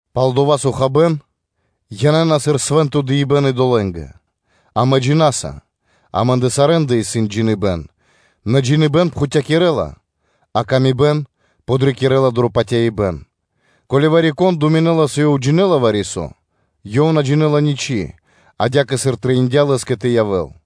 Пал дова́, со хабэ́н янэ́на сыр свэ́нто дыибэ́н идолэ́нгэ, амэ джина́са (амэ́ндэ сарэ́ндэ исын джиныбэ́н): нэ джиныбэ́н пхутькирэла, а ла́ска (паты́в) кэ яви́р мануша́ подрикирэ́ла дро патяибэ́н. Ко́ли вари-кон думинэ́ла, со ёв джинэ́ла вари-со, ёв на джинэ́ла ничы́ адя́кэ, сыр трэиндя́ лэ́скэ тэ явэ́л.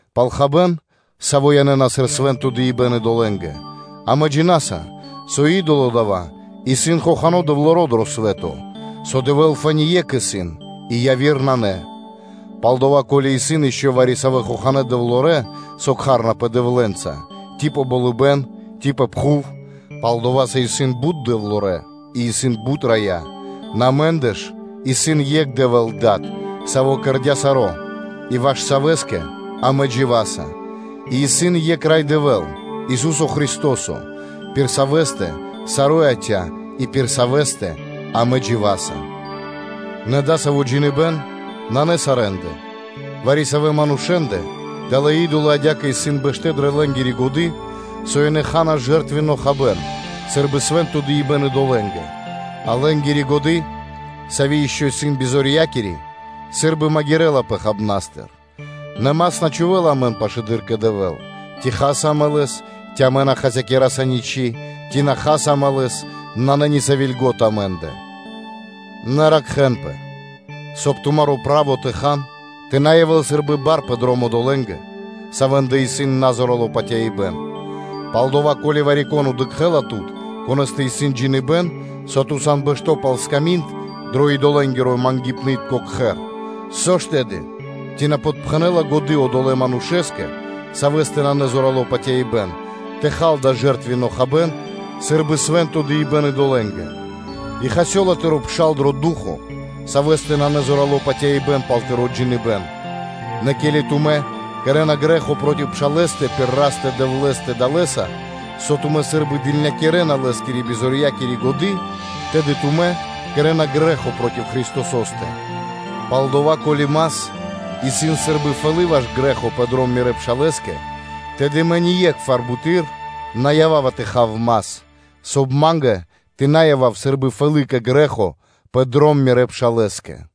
пал хабэ́н, саво́ янэ́на сыр свэ́нто дыибэ́н идолэ́нгэ, амэ джина́са, со идоло дава́ исын хохано́ дэвлоро дро свэ́то, со Дэвэ́л фэ́ни Екх исын, и яви́р нанэ. Палдава́, ко́ли исын ишчо (инкэ́) вари-савэ́ хоханэ́ дэвлорэ́, со кхарэнапэ “дэвлэнца”, ци дро болыбэ́н, ци пэ пхув (палдова́ со исын бут дэвлорэ́ и исын бут рая́), нэ амэ́ндэ ж исын екх Дэвэ́л Дад, Саво́ создыя́ саро́ и ваш Савэ́скэ амэ дживаса; и исын екх Рай Дэвэ́л, Ису́со Христо́со, пир Савэ́стэ саро́ яця́ и пир Савэ́стэ амэ дживаса. Нэ дасаво джиныбэ́н нанэ сарэ́ндэ: вари-савэ́ манушэ́ндэ далэ́ и́долы адя́кэ исын бэштэ́ дрэ лэ́нгири годы́, со ёнэ ха́на жэртвенно хабэ́н сы́рбы свэ́нто дыибэ́н идолэ́нгэ; а лэ́нгири годы́, сави́ ишчо (инкэ́) исын бизорьякири, сы́рбы магирэлапэ хабнастыр. Нэ мас на чхувэ́ла амэн пашылэды́р кэ Дэвэ́л; ци хаса амэ лэс, ци амэ на хасякираса ничы́, ци на хаса амэ лэс, нанэ ни сави́ льго́та амэ́ндэ. Нэ ракхэ́нпэ, соб (кай) тумаро́ право тэ хан тэ на явэ́л сы́рбы бар пэ дром одолэ́ндэ, савэ́ндэ исын назорало патяибэ́н. Палдава́, ко́ли вари-кон дыкхэ́ла тут, конэ́стэ исын джиныбэ́н, со ту сан бэшто́ пал сками́нд дро идолэнгирэ-мангипнытко кхэр, со ж тэды, ци на подпхэнэла годы́ одолэ́ манушэ́скэ, савэ́стэ нанэ зорало́ патяибэ́н, тэ хал дава́ жэртвенно хабэ́н сы́рбы свэ́нто дыибэ́н идолэ́нгэ? И хасёла тыро́ пшал дро ду́хо (фа́но), савэ́стэ нанэ зорало́ патяибэ́н пал тыро́ джиныбэ́н. Нэ ке́ли тумэ́ кэрэ́на грэ́хо проти пшалэ́стэ пир Растэ-Дэвлэ́стэ далэ́са, со тумэ́ сы́рбы дылнякирэна лэ́скири бизорьякири годы́, тэды тумэ́ кэрэ́на грэ́хо проти Христосо́стэ. Палдава́, ко́ли мас исын сы́рбы фэлы́ ваш грэ́хо пэ дром мирэ́ пшалэ́скэ, тэды мэ ние́кхвар буты́р на ява́ва тэ хав мас, соб (кай) ма́нгэ тэ на явав сы́рбы фэлы́ кэ грэ́хо пэ дром мирэ́ пшалэ́скэ.